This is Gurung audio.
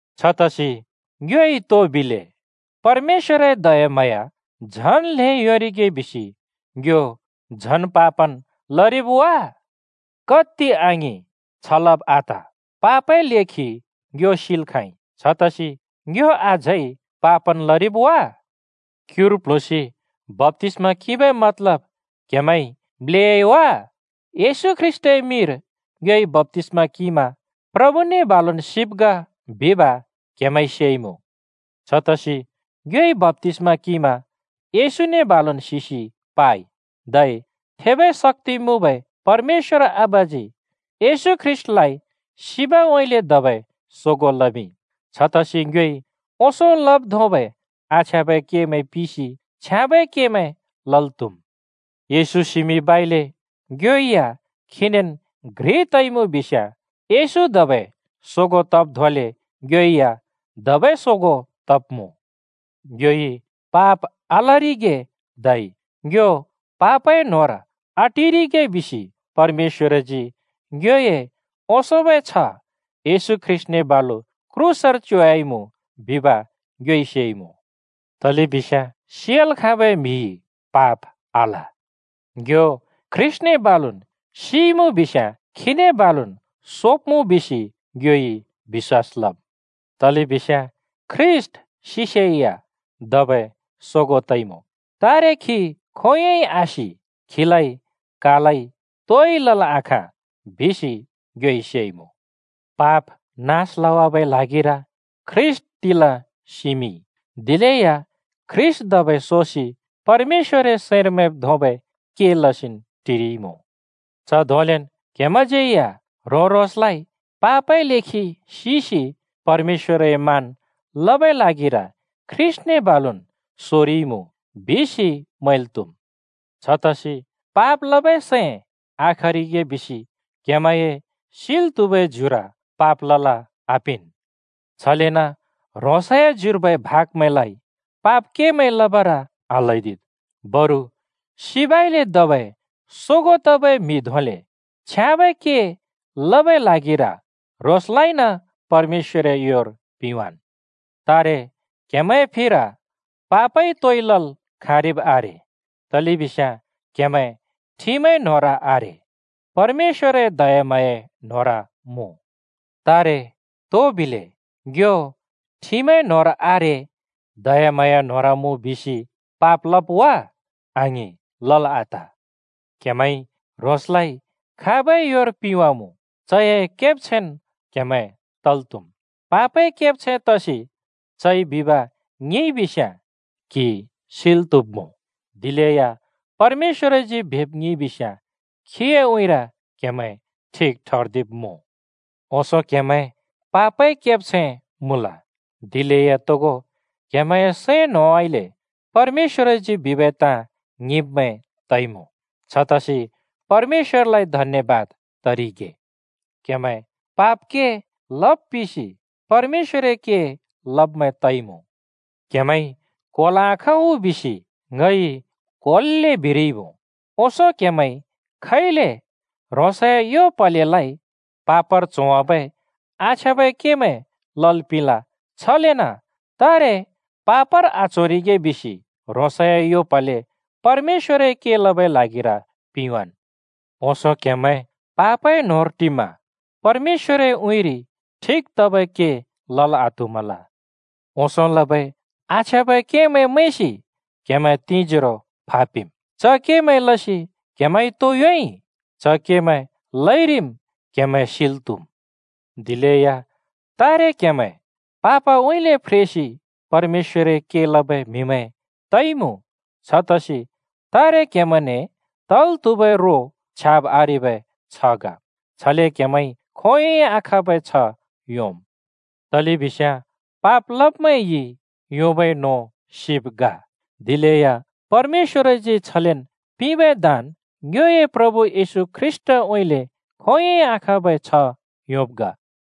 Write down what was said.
छतसि ङ्योइ तो बिले? परमेश्‍वरए दयाम्हाँया झन् ल्हें योंरिगे बिसि ङ्यो झन् पापन् लरिब् आ? कत्ति आङिं! छ लब आत। पापए लेखि ङ्यो सिल् खाँइ, छतसि ङ्यो अझै पापन् लरिब् आ? क्‍युर प्‍ल्हुँसि बप्‍तिस्‍मा किंबै मतलब क्‍हेमैंइ म्‍लेयाइ वा? येशू ख्रीष्‍टए मिंर ङ्योइ बप्‍तिस्‍मा किंमा प्रभुने बालुन् सिब् ग बिब क्‍हेमैंइ सेइमुँ। छतसि ङ्योइ बप्‍तिस्‍मा किंमा येशूने बालुन् सिसि पाइ, धै थेबै शक्‍ति मुँबै परमेश्‍वर आबाजी येशू ख्रीष्‍टलाइ सिबउँइँले धबै सोगों लमिंइ, छतसि ङ्योइ ओंसों लब् धोंबै आछ्याँबै केमैं पिसि छ्याँबै केमैं लल् त्हुम्। येशू सिमिंबइले ङ्यो या खीनेन् घ्रिन् तइमुँ बिस्याँ, येशू धबै सोगों तब् धोंले ङ्यो या धबै सोगों तब्‍मुँ। ङ्योइ पाप आलरिगे धै ङ्यो पापए न्होंर आटिरिगे बिसि परमेश्‍वरजी ङ्योए ओंसोंबै छ्ह येशू ख्रीष्‍टने बालु क्रूसर च्योवाइमुँ बिब ङ्योइ सेइमुँ। तलेबिस्याँ सियाल् खाँबै म्‍हिइ पाप आल। ङ्यो ख्रीष्‍टने बालुन् सिइमुँ बिस्याँ, खीने बालुन् सोब्मुँ बिसि ङ्योइ बिश्‍वास लम्। तलेबिस्याँ ख्रीष्‍ट सिसेया धबै सोगों तइमुँ, तारे खी खोंयोंइ आसि, खीलाइ कालइ तोइ लल् आखाँ बिसि ङ्योइ सेइमुँ। पाप नास लवाबै ल्हागिर ख्रीष्‍ट तिला सिमिंइ, दिलेया ख्रीष्‍ट धबै सोसि परमेश्‍वरए सैंर मैंब् धोंबै के लसिन् टिरिइमुँ। च धोंलेन् क्‍हेमैंज्‍यै या ह्रों-ह्रोंसलाइ पापए लेखि सिसि परमेश्‍वरए मान लबै ल्हागिर ख्रीष्‍टने बालुन् सोरिइमुँ बिसि मैंल् त्‍हुम्। छतसि पाप लबै सैं आखरिगे बिसि क्‍हेमैंए सिल् त्‍हुबै ज्युर पाप लल् आपिंन्। छलेन ह्रोंसए ज्युर्बै भागमैंलाइ पाप केमैं लबर आल्हैदिद्। बरु सिबइले धबै सोगों तबै म्‍हि धोंले छ्याँबै के लबै ल्हागिर ह्रोंसलाइन परमेश्‍वरए योर पिंवाँन्। तारे क्‍हेमैंए फिर पापइ तोइ लल् खाँरिब् आरे, तलेबिस्याँ क्‍हेमैं ठिमए न्होंर आरे, परमेश्‍वरए दयाम्हाँयाए न्‍होंर मुँ। तारे तो बिले? ङ्यो ठिमए न्होंर आरे, दयाम्हाँया न्‍होंर मुँ बिसि पाप लब् वा? आङिं, लल् आत! क्हेमैंइ ह्रोंसलाइ खाबै योर पिंवाँमुँ? चए केब्छैंन् क्हेमैं तल् त्‍हुम्। पापए केब्छैं तसि चइ बिब ङिंइ बिस्याँ क्हि सिल् त्हुब्मुँ, दिलेया परमेश्‍वरजी बिब ङिंइ बिस्याँ खीए उँइँर क्‍हेमैं ठिक ठर्दिब्मुँ। ओंसों क्‍हेमैं पापए केब्छैं मुँल, दिलेया तोगो क्‍हेमैंए सैं न्होंउँइँले परमेश्‍वरजी बिबै ताँ ङिंब्मैं तइमुँ। छतसि परमेश्‍वरलाइ धन्‍यबाद तरिगे। क्‍हेमैं पाप के लब् पिसि परमेश्‍वरए के लब्मैं तइमुँ। क्हेमैंइ क्होल् आखाँ उ बिसि ङइ क्‍होल्‍ले बिरिइमुँ। ओंसों क्हेमैंइ खैले ह्रोंसए यो प्हलेलाइ पापर च्होवाबै आछ्याँबै केमैं लल् पिंल। छलेन तारे पापर आच्होरिगे बिसि ह्रोंसए यो प्हले परमेश्‍वरए के लबै ल्हागिर पिंवाँन्। ओंसों क्‍हेमैं पापए न्होंर टिमा परमेश्‍वरए उँइँरि ठिक तबै के लल् आत्हुमल। ओंसों लबै आछ्याँबै केमैं मैंसि क्हेमैं तिंजोरो फापिम्। च केमैं लसि क्‍हेमैंइ तो योंइ? च केमैं लइरिम् क्हेमैं सिल् त्हुम्। दिलेया तारे क्‍हेमैं पापउँइँले फ्रेसि परमेश्‍वरए के लबै म्हिमैं तइमुँ। छतसि तारे क्हेमैंने तल् त्हुबै रो छ्याब् आरेबै छ्ह ग। छले क्हेमैंइ खोंयोंइ आखाँबै छ्ह योंम्। तलेबिस्याँ पाप लब्मैंइ योंबै नों सिब ग! दिलेया परमेश्‍वरजी छलेन् पिंबै दान ङ्योए प्रभु येशू ख्रीष्‍टउँइँले खोंयोंइ आखाँबै छ्ह योंब् ग।